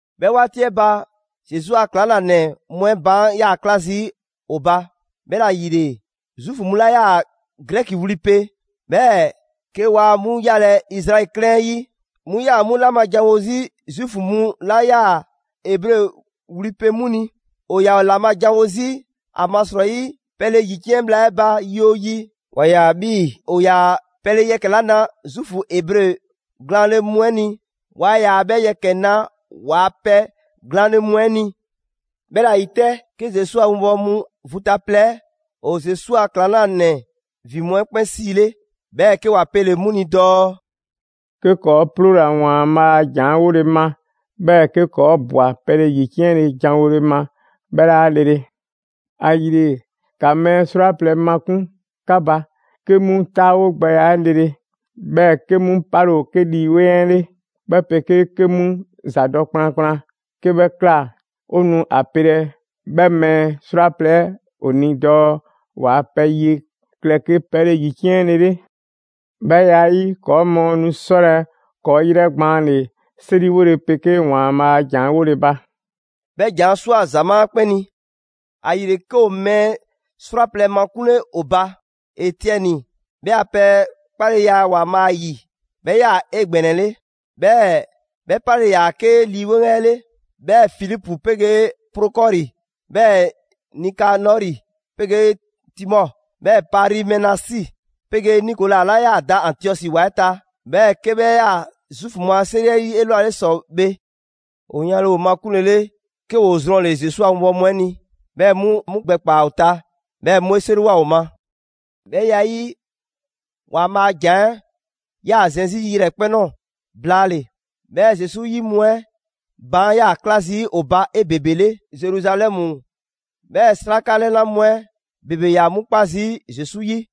'Bhɛ 'waati 'ɛ ba, Zesu a ‑klaŋlanɛ mu 'ɛ baan' 'yaa‑ 'kla zii' ‑o ba. 'Bhɛla‑ ‑yile, Zuufu mu 'la 'yaa‑ Grɛki wli pe, 'bhɛɛ‑ 'ke waa 'mu yalɛ Izraɛli 'klɛɛn 'ɛ 'yi, 'mu 'yaa‑ 'mu 'la ma janwo 'zi Zuufu mu 'la 'yaa‑ Ebre wli pe 'mu ni. ‑O ‑yaa ‑o ‑la ma janwo 'zi ‑amasrɔyi pɛle ‑yiciɛn' bhla 'ɛ ba yi 'oo yi, ‑wa ꞊ya 'bhii‑ ‑o ‑yaa pɛle yɛkɛ‑ 'la na Zuufu Ebre glaanle mu 'ɛ ni, waa ‑yaa 'bhɛ yɛkɛ‑ na ‑waa' pɛ glaanle mu 'ɛ ni. 'Bhɛla‑ 'yi 'tɛ, 'ke Zesu a 'winbɔwo mu vu ta plɛ 'ɛ, ‑o Zesu a ‑klaŋlanɛ ‑vin mu 'ɛ 'kpɛn 'siile, 'bhɛɛ‑ 'ke ‑wa pele‑ 'mu ni dɔɔ: «'Ke ‑kɔɔ' 'ploola‑ ‑Waanbhaa' a ‑jan 'ɛ 'wole‑ ma, 'bhɛɛ‑ 'ke ‑kɔɔ' ꞊bwa pɛle ‑yiciɛnle ‑janwole ma, 'bhɛ 'laa lele. ‑Ayile, ‑ka mɛɛ 'srwaplɛ‑ makun' 'ka ba, 'ke 'mu 'taawogbɛya 'ɛ lele, 'bhɛɛ‑ 'ke 'mu 'pale‑ ‑o 'ke Lii 'Weŋ 'ɛ 'le, 'bhɛ 'pegee 'ke 'mu ‑zadɔ' kplankplan. 'Ke 'bhɛ ꞊kla, 'o nu 'a pelɛ 'bhɛ mɛɛ 'srwaplɛ‑ 'ɛ ‑o ni dɔɔ ‑waa' pɛ ye klɛ 'ke pɛle ‑yiciɛnlele. 'Bhɛ ya 'ɛ 'yi, ‑kɔɔ' mɔɔ nu 'sɔlɛ‑ ‑kɔɔ' 'yrɛgbaanle 'seriwole 'pegee ‑Waanbhaa' a ‑jan 'ɛ 'wole‑ ba.» 'Bhɛ ‑jan 'ɛ ꞊swa ‑zamaa' 'ɛ 'kpɛn ni. ‑Ayile, 'ke ‑o mɛɛ 'srwaplɛ‑ makunle ‑o ba: Etiɛni, 'bhɛ a pɛ 'kpaleya 'ɛ ‑Waanbhaa' 'yi 'bhɛ 'yaa‑ 'egbɛnɛle, 'bhɛɛ‑ 'bhɛ 'pale‑ ‑yaa 'ke Lii 'Weŋ 'ɛ 'le; 'bhɛɛ‑ Filipu 'pegee Prokɔri, 'bhɛɛ‑ Nikanɔri 'pegee Timɔ, 'bhɛɛ‑ Parimenasi 'pegee Nikola 'la 'yaa‑ da Antiɔsi ‑wa 'ɛ ta, 'bhɛɛ‑ 'ke 'bhɛ 'yaa‑ Zuufu mu a 'seri 'ɛ 'yi 'elwale ‑sɔ bhe. ‑O yanle ‑o makunlele, 'ke ‑woo zrɔnle‑ Zesu a 'winbɔwo mu 'ɛ ni. 'Bhɛ mu 'mu gbɛ ‑kpaa ‑o ta, 'bhɛɛ‑ 'mu 'e 'seriwoa ‑o ma. 'Bhɛ ya 'ɛ 'yi, ‑Waanbhaa' a ‑jan 'ɛ ‑yaa zɛn 'zi yrɛkpɛn‑ ꞊nɔɔ blaale‑. 'Bhɛɛ‑ Zesu 'yi mu 'ɛ baan' 'yaa‑ 'kla zii' ‑o ba 'ebebele Zeruzalɛmu, 'bhɛɛ‑ 'sraka 'lɛna mu 'ɛ ‑bebe 'yaa‑ 'mu 'kpa zii' Zesu 'yi.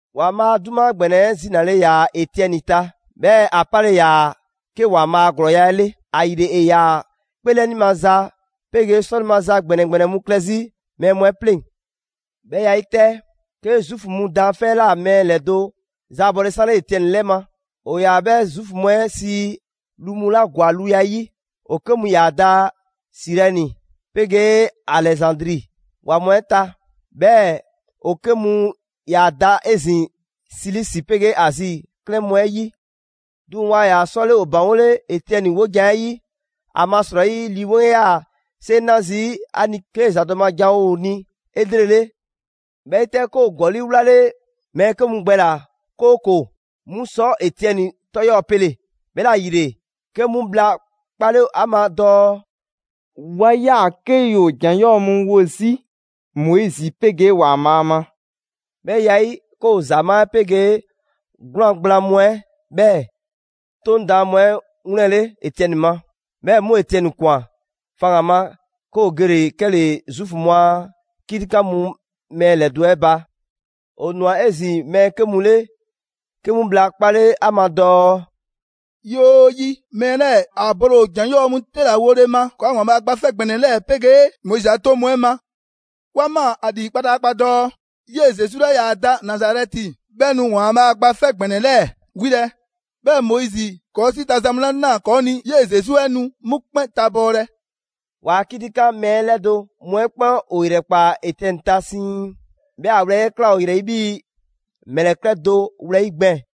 ‑Waanbhaa' a 'duma ‑gbɛnɛ 'ɛ zinale ‑yaa Etiɛni ta, 'bhɛɛ‑ ‑a pale ‑yaa 'ke ‑Waanbhaa' a ‑glɔɔya' 'ɛ 'le. ‑Ayile, ‑e ‑yaa 'kpeelɛni maza 'pegee 'sɔle‑ maza ‑gbɛnɛ ‑gbɛnɛ mu klɛ 'zi mɛɛ mu 'ɛ 'pleŋ. 'Bhɛ ya 'ɛ 'yi 'tɛ, 'ke Zuufu mu daanfɛ' 'ɛ ꞊la mɛɛ ‑lɛdo' 'ɛ zaabɔle 'sanle Etiɛni 'lɛ ma. ‑O ‑yaa 'bhɛ Zuufu mu 'ɛ sii: «Lu mu 'la ‑gwa luya 'yi». ‑O 'ke mu ‑yaa da Sirɛni 'pegee Alɛzandri ‑wa mu 'ɛ ta. 'Bhɛɛ‑ ‑o 'ke mu ‑yaa da 'ezin‑ Silisi 'pegee Azi 'klɛɛn mu 'ɛ 'yi. 'Duŋ‑ waa ‑yaa 'sɔle ‑o ‑baŋgole Etiɛni 'wojan‑ 'ɛ 'yi, ‑amasrɔyi Lii 'Weŋ 'ɛ 'yaa‑ 'seŋ 'na zii' ‑a ni 'kee‑ ‑zadɔ' ma ‑janwo' ‑o ni 'elrele. 'Bhɛ 'yi 'tɛ, 'ke ‑o ‑gɔli' 'wlale mɛɛ 'ke mu gbɛ ꞊la, 'kooko‑ 'mu sɔ Etiɛni 'tɔ 'yɔɔ‑ pele‑; 'bhɛla‑ ‑yile, 'ke 'mu bhla 'kpale ‑a ma dɔɔ: «'Wa ꞊ya 'ke ‑yoo ‑jan 'yɔɔ‑ mu wo 'zi Moizi 'pegee ‑Waanbhaa' ma.» 'Bhɛ ya 'ɛ 'yi, 'ke ‑o ‑zamaa' 'ɛ 'pegee 'gwlaan‑ gblaan mu 'ɛ, 'bhɛɛ‑ 'Toŋ daan mu 'ɛ 'wlɛnle‑ Etiɛni ma. 'Bhɛ mu Etiɛni ꞊kwan faŋgan‑ ma, 'ke ‑o gele‑ 'kɛle‑ Zuufu mu a 'kitikan mu mɛɛ ‑lɛdo' 'ɛ ba. ‑O ꞊nwa 'ezin‑ mɛɛ 'ke mu 'le 'ke mu bhla 'kpale ‑a ma dɔɔ: «Yi 'oo yi, mɛɛ 'lɛɛ‑ ‑a bole ‑o ‑jan 'yɔɔ‑ mu 'te ‑la wole ma ‑kɔɔa' ‑Waanbhaa' Gba 'Fɛ ‑Gbɛnɛ 'lɛɛ‑ 'pegee Moizi a 'toŋ 'ɛ ma! 'Wa ꞊maa ‑a ‑lii kpataakpa dɔɔ 'yee‑ Zesu 'la 'yaa‑ da Nazarɛti 'bhɛ nu ‑Waanbhaa' Gba 'Fɛ ‑Gbɛnɛ 'lɛɛ‑ 'wilɛ‑, 'bhɛɛ‑ Moizi ‑kɔɔ' 'si ta za mu 'la ꞊naa ‑kɔɔ' ni 'yee‑ Zesu 'ɛ nu 'mu 'kpɛn tabɔɔlɛ.» ‑Waa' 'kitikan mɛɛ ‑lɛdo' mu 'ɛ 'kpɛn ‑o ‑yrɛkpaa Etiɛni ta siiŋ. 'Bhɛɛ‑ ‑a wlɛyi' 'ɛ ꞊kla ‑o ‑yrɛ 'yi 'bhii‑ ‑mlɛkɛ' do wlɛyi' gbɛɛn‑.